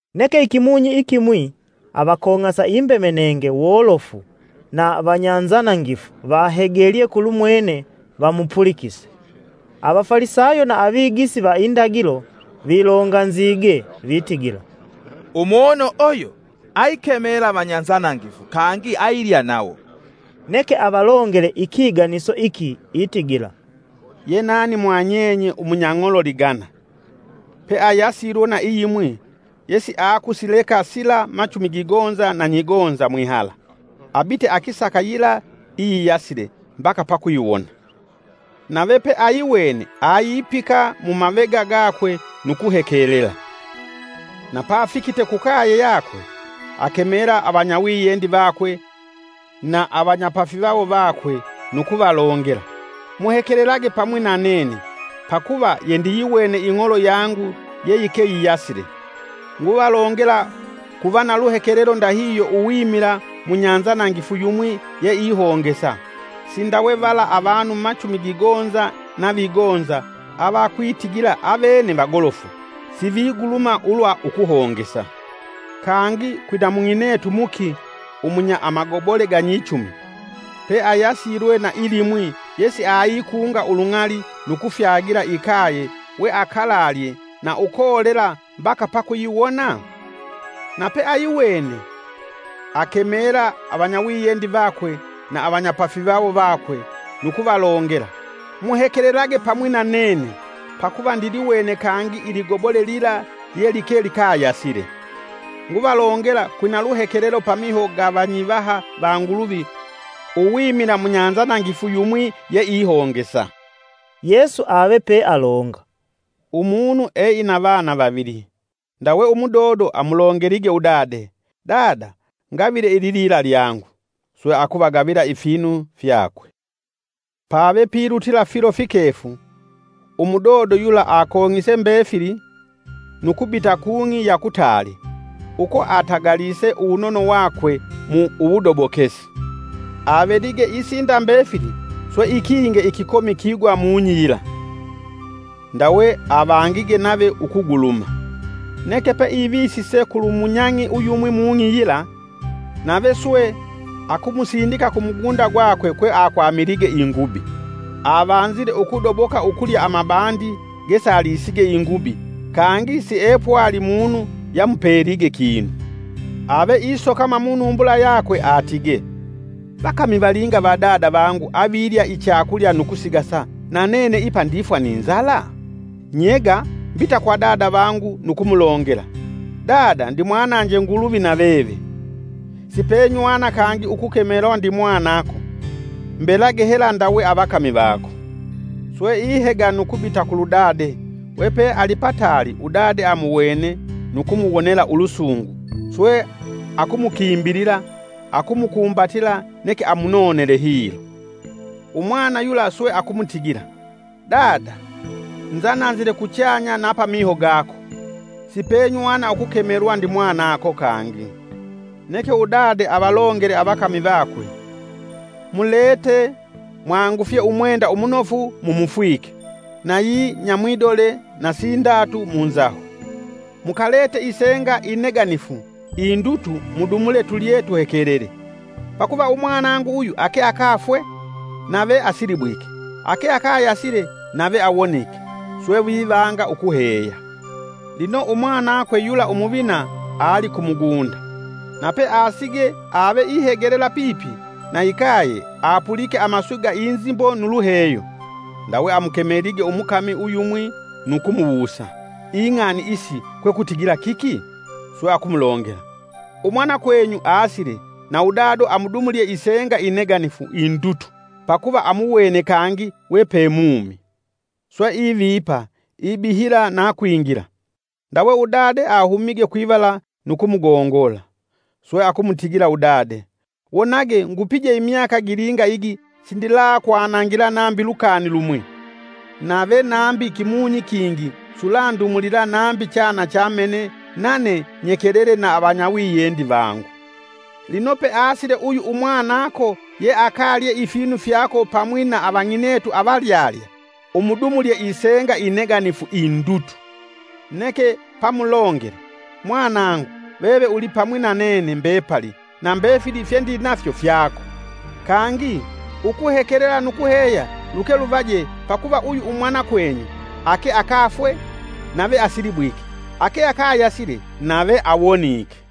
Neke ikimunyi ikimwi, avakong'asa imbemenenge wolofu na vanyanzanangifu vahegelye kulumwene vamupulikise. Avafalisayo na Avigisi va indagilo vilonganzige vitigila: “Umunu uyu! Aikemela vanyanzanangifu, kangi ailya nawo.” Neke avalongele ikiganiso iki itigila: “Ye nani mwa nyenye umunyang'olo ligana, peayasilwe na iyimwi yesiakusileka sila machumi gigonza na nyigonza mwihala, abite akisaka yila iyiyasile mbaka pakuyiwona. Nave peayiwene, ayipika mumavega gakwe nu kuhekelela. Na pafikite kukaye yakwe, akemela avanyawiyendi vakwe na avanyapafivawo vakwe nu kuvalongela, ‘Muhekelelage pamwi na nene, pakuva yendiyiwene ing'olo yangu yeyikeyiyasile.’ Nguvalongela, kuva na luhekelelo ndahihyo, uwimila munyanzanangifu yumwi yeihongesa. Sindawe vala avanu machumi gigonza na vigonza avakwitigila avene vagolofu siviguluma ulwa ukuhongesa. “Kangi kwina mung'inetu muki umunya amagobole ganyichumi, peayasilwe na ilimwi yesiaikunga ulung'ali nu kufyagila ikaye weakalalye na ukolela mbaka pakuyiwona? Na peayiwene, akemela avanyawiyendi vakwe na avanyapafivawo vakwe nu kuvalongela, ‘Muhekelelage pamwi na nene, pakuva ndiliwene kangi iligobole lila lyelike likayasile.’ Nguvalongela kwina luhekelelo pamiho ga vanyivaha va Nguluvi uwimila munyanzanangifu yumwi yeihongesa.” Yesu ave pealonga, “umunu eina vana vavili. Ndawe umudodo amulongelige udade, ‘Dada, ngavile ililila lyangu.’ Swe akuvagavila ifinu fyakwe. Pave pilutila filo fikefu, umudodo yula akong'ise mbefili, nu kubita kung'i ya kutaali, uko atagalise uwunono wakwe mu uwudobokesi. Avelige isinda mbefili swe ikinge ikikomi kigwa mung'i yila, ndawe avangige nave ukuguluma. Neke peivisise kulu munyang'i uyumwi mung'i yila, nave swe akumusindika kumugunda gwakwe kweakwamilige ingubi. Avanzile ukudoboka ukulya amabandi gesalisige ingubi kangi siepwali munu yamupelige kinu. Ave isokama munumbula yakwe atige: ‘Vakami valinga va dada vangu avilya ichakulya nu kusigasa, na nene ipa ndifwa ni nzala? Nyega, mbita kwa dada vangu nu kumulongela: Dada, ndimwananje Nguluvi na veve. Sipenywana kangi ukukemelwa ndimwanako, mbelage hela ndawe avakami vako.’ Swe ihega nu kubita kulu dade. Wepe alipataali udade, amuwene, nu kumuwonela ulusungu swe akumukimbilila akumukumbatila neke amunonele hilo. “Umwana yula swe akumutigila: ‘Dada, nzananzile kuchanya na pamiho gako, sipenywana ukukemelwa ndimwanako kangi.’ Neke udade avalongele avakami vakwe: ‘Mulete mwangufye umwenda umunofu mumufwike! nayi nyamwidole na sindatu munzaho. Mukalete isenga ineganifu indutu mudumule tulye tuhekelele! Pakuva umwanangu uyu ake akafwe, nave asilibwike ake akayasile nave awonike.’ Swe vivanga ukuheya. “Lino umwanakwe yula umuvina ali ku mugunda. Na peasige ave ihegelela pipi na ikaye apulike amaswi ga inzimbo nu luheyo. Ndawe amukemelige umukami uyumwi nu kumuwusa,: ‘Ing'ani isi kwekutigila kiki?’ Swe akumulongela: ‘Umwanakwenyu asile na udado amudumulye isenga ineganifu indutu pakuva amuwene kangi wepe mumi.’ Swe ivipa, ibihila na kwingila. Ndawe udade ahumige kwivala nu kumugongola. Swe akumutigila udade, ‘Wonage ngupije imyaka gilinga igi sindilakwanangila nambi lukani lumwi, nave nambi kimunyi kingi sulandumulila nambi chana cha mene nane nyekelele na avanyawiyendi vangu! Lino peasile uyu umwanako yeakalye ifinu fyako pamwi na avang'inetu avalyalya umudumulye isenga ineganifu indutu.’ Neke pamulongele: ‘Mwanangu, veve ulipamwi na nene mbepali na mbefili fye ndinafyo fyako. Kangi, ukuhekelela nu kuheya luke luvaje pakuva uyu umwanakwenyu ake akafwe, nave asilibwike ake akayasile, nave awonike.’”